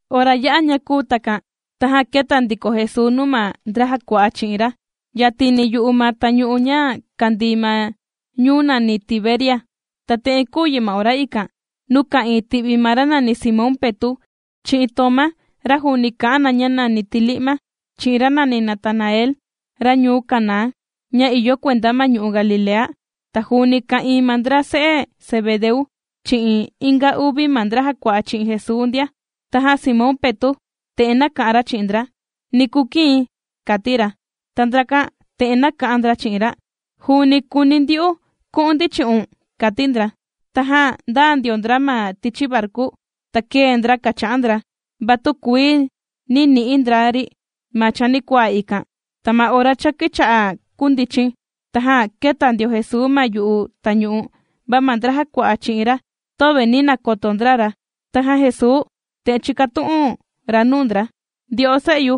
Ora ya'a ña kūu takan, tajan kēta ndiko Jesuu nuu ma ndra jàkua'a chi'in ra, yatini yu'u ma tañu'u ña kàndii ma ñuu nàni Tiberias. Ta te'en kūu yi ma ora ikan: Nuu ka'ìin ti'vi ma ra nani Simón Petu', chi'in Tomá, ra juuni kà'an na ña nàni Tili'ma, chi'in ra nàni Natanael, ra ñuu Caná, ña ìyo kuenda ma ñu'u' Galilea, ta juuni ka'ìin ma ndra se'e Zebedeu, chi'in inga uvi ma ndra jàkua'a chi'in Jesuu ndia. Tajan Simón Petu', te'en nāka'an ra chi'in ndra: ―Ni kukii̱n ―kàti ra. Ta ndrakan te'en nāka'an ndra chi'in ra: ―Juuni kùuni ndyu'u ku'un ndi chi'un ―kàti ndra. Tajan ndāa ndio ndra ma tichi varku, ta kēe ndra kàcha'an ndra, va tükuii nī ni'i ndra ri ma chanikuaa ikan. Ta ma ora cha kīcha'a kundichin, tajan kēta ndio Jesuu ma yu'u tañu'u, va ma ndra jàkua'a chi'in ra, töve nī nakoto ndra ra. Tajan Jesuu te'en chīkatu'un ra nuu ndra: ―Ndyo'o se'yu,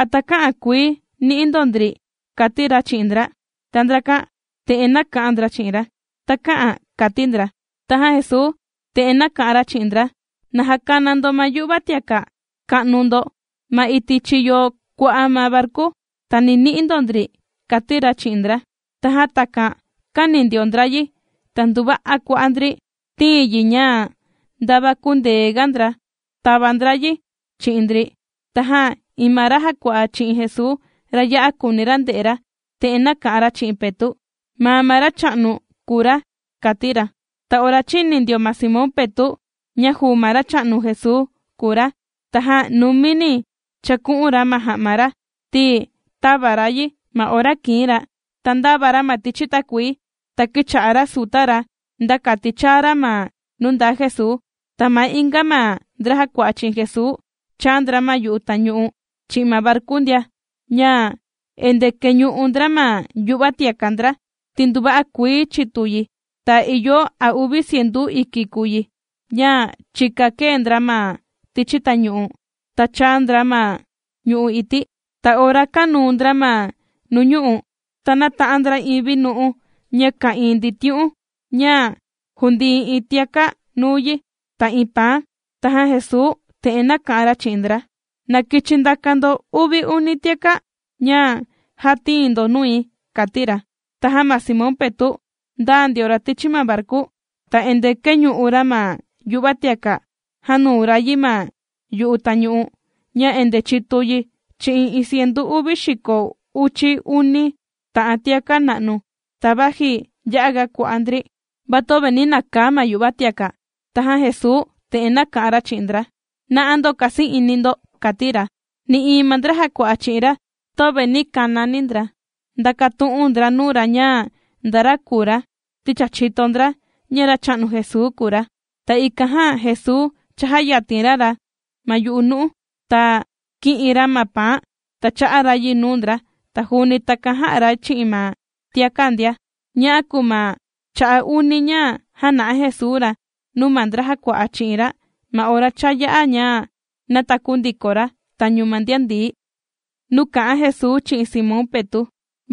¿a takä'an kuii ni'i ndo ndri? ―kàti ra chi'in ndra. Ta ndrakan te'en nāka'an ndra chi'in ra: ―Takä'an ―kàti ndra. Tajan Jesuu te'en nāka'an ra chi'in ndra: ―Na jakana ndo ma yu'va tiaka' ka'nu ndo ma iti' chiyo kua'a ma varku, ta ni ni'i ndo ndri ―kàti ra chi'in ndra. Tajan takan kāni ndio ndra yi, ta nduva'a kua'a' ndri tīin yi ña ndava kündeega ndra tava ndra yi chi'in ndri. Tajan iin ma ra jàkua'a chi'in Jesuu, ra ya'a kùuni ra nde'e ra, te'en nāka'an ra chi'in Petu': ―¡Maa ma Racha'nu kùu ra! ―kàti ra. Ta ora chīni ndio ma Simón Petu', ña juu ma Racha'nu Jesuu kùu ra, tajan numini chāku'un ra ma ja'ma ra, ti tāva ra yi, ma ora kìin ra, ta ndāva ra ma tichi takuii, ta kīcha'a ra suta ra nda kati chaa ra ma nuu ndaa Jesuu. Ta ma inga ma ndra jàkua'a chi'in Jesuu chāa ndra ma yu'u tañu'u chi'in ma varku ndia, ña endee kèñu'u ndra ma yu'va tiaka' ndra, ti nduva'a kuii chitu yi. Ta ìyo a uvi cientu iki kùu yi, ña chika kēe ndra ma tichi tañu'u, ta chāa ndra ma ñu'u' ití. Ta ora kānuu ndra ma nuu ñu'u', ta nāta'an ndra iin vinu'u ña ka'ìin nditiu'un, ña jùndii iin tiaka' nuu yi, ta iin paan. Tajan Jesuu te'en nāka'an ra chi'in ndra: ―Na kichi ndaka ndo uvi uni tiaka' ña já tīin ndo nui ―kàti ra. Tajan ma Simón Petu' ndāa ndio ra tichi ma varku, ta endee kēñu'u ra ma yu'va tiaka' jānuu ra yi ma yu'u tañu'u, ña endee chitu yi chi'in iin cientu uvi xiko uchi uni ta'an tiaka' na'nu. Ta vaji ya'aga kua'a' ndri, va töve nī nakaa ma yu'va tiaka'. Tajan Jesuu te'en nāka'an ra chi'in ndra: ―¡Na'a ndo kasi'ini ndo! ―kàti ra. Nï'iin ma ndra jàkua'a chi'in ra, töve nī kanani ndra ndàkatu'un ndra nuu ra ña nda ra kùu ra, ti cha chìto ndra, ña Racha'nu Jesuu kùu ra. Ta ikan jan Jesuu chājayatin ra ra ma yu'u nu'u, ta kī'in ra ma paan ta chā'a ra yi nuu ndra, ta juuni takan jā'a ra chi'in ma tiaka' ndia. Ña'a kùu ma cha'a' uni, ña jāna'a Jesuu ra nuu ma ndra jàkua'a chi'in ra, ma ora cha yā'a ña nātaku ndiko ra tañu ma ndian ndií. Nuu kà'an Jesuu chi'in Simón Petu'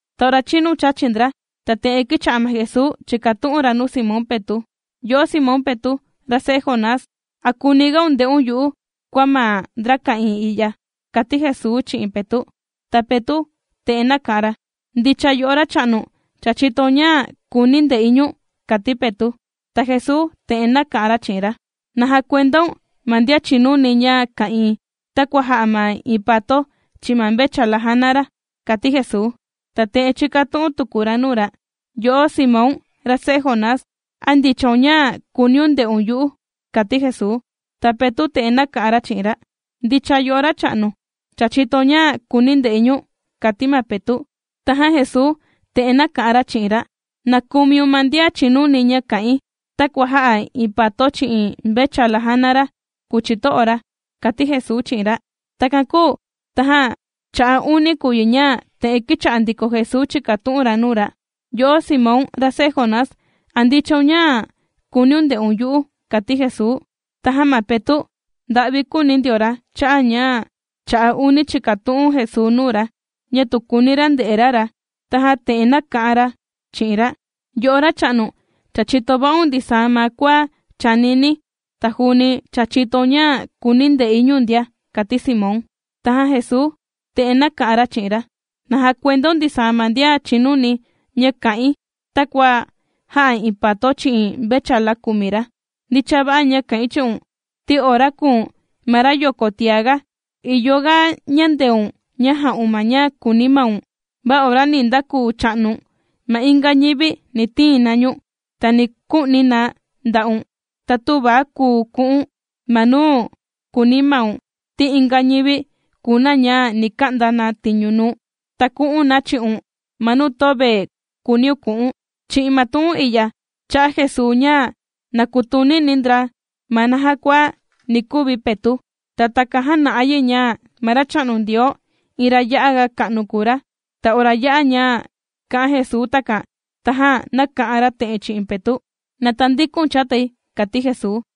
Ta ora chinu chāchi ndra, ta te'en kīcha'a ma Jesuu chìkatu'un ra nuu ma Simón Petu': ―Yo'o Simón Petu', ra se'e Jonás, ¿a kùunigaun nde'un yu'u, kua ma ndra ka'ìin i'ya? ―kàti Jesuu chi'in Petu'. Ta Petu' te'en nāka'an ra: ―Ndicha yo'o Racha'nu, cha chìtoun ña kùuni̱ nde'i ñu̱n ―kàti Petu'. Ta Jesuu te'en nāka'an ra chi'in ra: ―Na jakuendaun ma ndian chìnuni ña kà'in, takua jà'a ma iin pato chi'in ma mvechala jàna ra ―kàti Jesuu. Ta te'en chīkatu'un tuku ra nuu ra: ―Yo'o Simón, ra se'e Jonás, ¿a ndichaun ña kùuniun nde'un yu'u? ―kàti Jesuu. Ta Petu' te'en nāka'an ra chi'in ra: ―Ndicha, yo'o Racha'nu, cha chìtoun ña kùuni̱ nde'i ñu̱n ―kàti ma Petu'. Tajan Jesuu te'en nāka'an ra chi'in ra: ―Na kumiun ma ndian chinuni ña kà'in, takua jà'a iin pato chi'in mvechala jàna ra kùu chito'o ra ―kàti Jesuu chi'in ra. Takan kūu tajan cha'a' uni kùu yi ña, te'en kīcha'a ndiko Jesuu chìkatu'un ra nuu ra: ―Yo'o Simón, ra se'e Jonás, ¿a ndichaun ña kùuniun nde'un yu'u? ―kàti Jesuu. Tajan ma Petu' nda'vi kūuni ndio ra cha'a' ña, cha'a' uni chìkatu'un Jesuu nuu ra, ña tu kùuni ra nde'e ra ra, tajan te'en nāka'an ra chi'in ra: ―Yo'o Racha'nu, cha chìto va'un ndisaa ma kua chànini̱, ta juuni cha chìtoun ña kùuni̱ nde'i ñu̱n ndia ―kàti Simón. Tajan Jesuu te'en nāka'an ra chi'in ra: ―Na jakuendaun ndisaa ma ndian chìnuni ña kà'in takua jà'a iin pato chi'in mvechala kùmi ra. Ndicha va'a ña kà'in chi'un, ti ora kùu̱n ma rayoko tiaga, ìyo ga ñandeun ña jà'un ma ña kùuni maun, va ora ni ndakuu cha'nu̱n, ma inga ñivi ni tiin na ñu̱n, ta ni ku'ni na nda'un, ta tüva kùu ku'u̱n ma nuu kùuni maun, ti inga ñivi kùu na ña ni ka'nda na tiñu nuu̱n, ta ku'un na chi'un ma nuu töve kùuniun ku'u̱n. Chi'in ma tu'un i'ya, chā'a Jesuu ña na kutunini ndra ma naja kua ni kuvi Petu', ta takan jàna'a yi ña ma Racha'nu Ndioo, iin ra ya'aga ka'nu kùu ra. Ta ora yā'a ña kā'an Jesuu takan, tajan nāka'an ra te'en chi'in Petu': ―¡Na tandikun chatai! ―kàti Jesuu.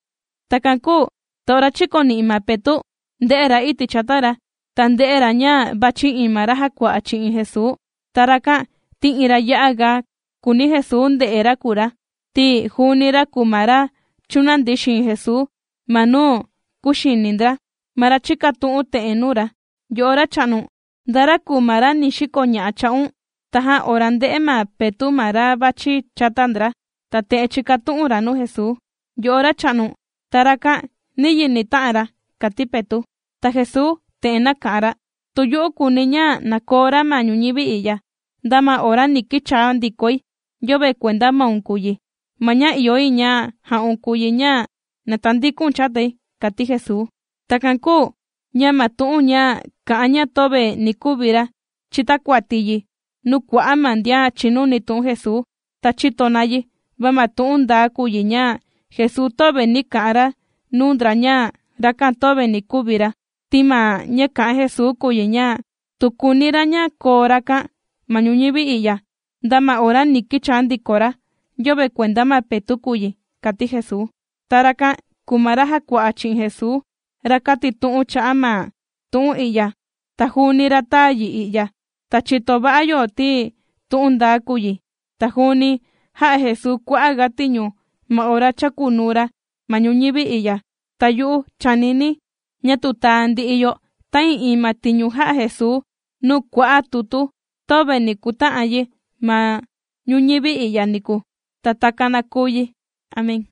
Takan kūu ta ora chīkoni'i ma Petu' ndē'e ra iti' chata ra, ta ndē'e ra ña vàchi iin ma ra jàkua'a chi'in Jesuu. Ta rakan ti iin ra ya'a ga kùuni Jesuu nde'e ra kùu ra, ti juuni ra kùu ma ra chūnandi xiin Jesuu ma nuu kūxini ndra, ma ra chīkatu'un te'en nuu ra: “Yo'o Racha'nu, ¿nda ra kùu ma ra ni xikoña'a cha'un?” kàti Jesuu. Tajan ora ndē'e ma Petu' ma ra vàchi chata ndra, ta te'en chīkatu'un ra nuu Jesuu: ―Yo'o Racha'nu, ta rakan, ¿niyi ni ta'an ra? ―kàti Petu'. Ta Jesuu te'en nāka'an ra: ―Tu yu'u kùuni̱ ña na koo ra ma ñuñivi i'ya, nda ma ora ni kichaa ndikoi, yöve kuenda maun kùu yi. Ma ña ìyo yi ña ja'un kùu yi ña na tandiku̱n chatai ―kàti Jesuu. Takan kūu ña ma tu'un ña kà'an ña töve ni kuvi ra, chītakuati yi nuu kua'a' ma ndian chìnuni tu'un Jesuu, ta chīto na yi. Va ma tu'un ndaa kùu yi ña Jesuu töve nī ka'an ra nuu ndra ña rakan töve ni kuvi ra, ti ma ña kā'an Jesuu kùu yi ña: tu kùuni ra ña koo rakan ma ñuñivi i'ya, nda ma ora ni kichaa ndiko ra, yöve kuenda ma Petu' kùu yi, kàti Jesuu. Ta rakan kùu ma ra jàkua'a chi'in Jesuu, ra kàtitu'un cha'a' ma tu'un i'ya ta juuni ra tāa yi i'ya. Ta chìto va'a yo, ti tu'un ndaa kùu yi. Ta juuni jā'a Jesuu kua'a' ga tiñu ma ora chākunuu ra ma ñuñivi i'ya. Ta yu'u chànini̱, ña tu taa ndi'i yo ta'ii'iin ma tiñu jā'a Jesuu nuu kua'a' tutu, töve ni kuta'an yi ma ñuñivi i'ya niku. Ta takan na kuu yi. Amén.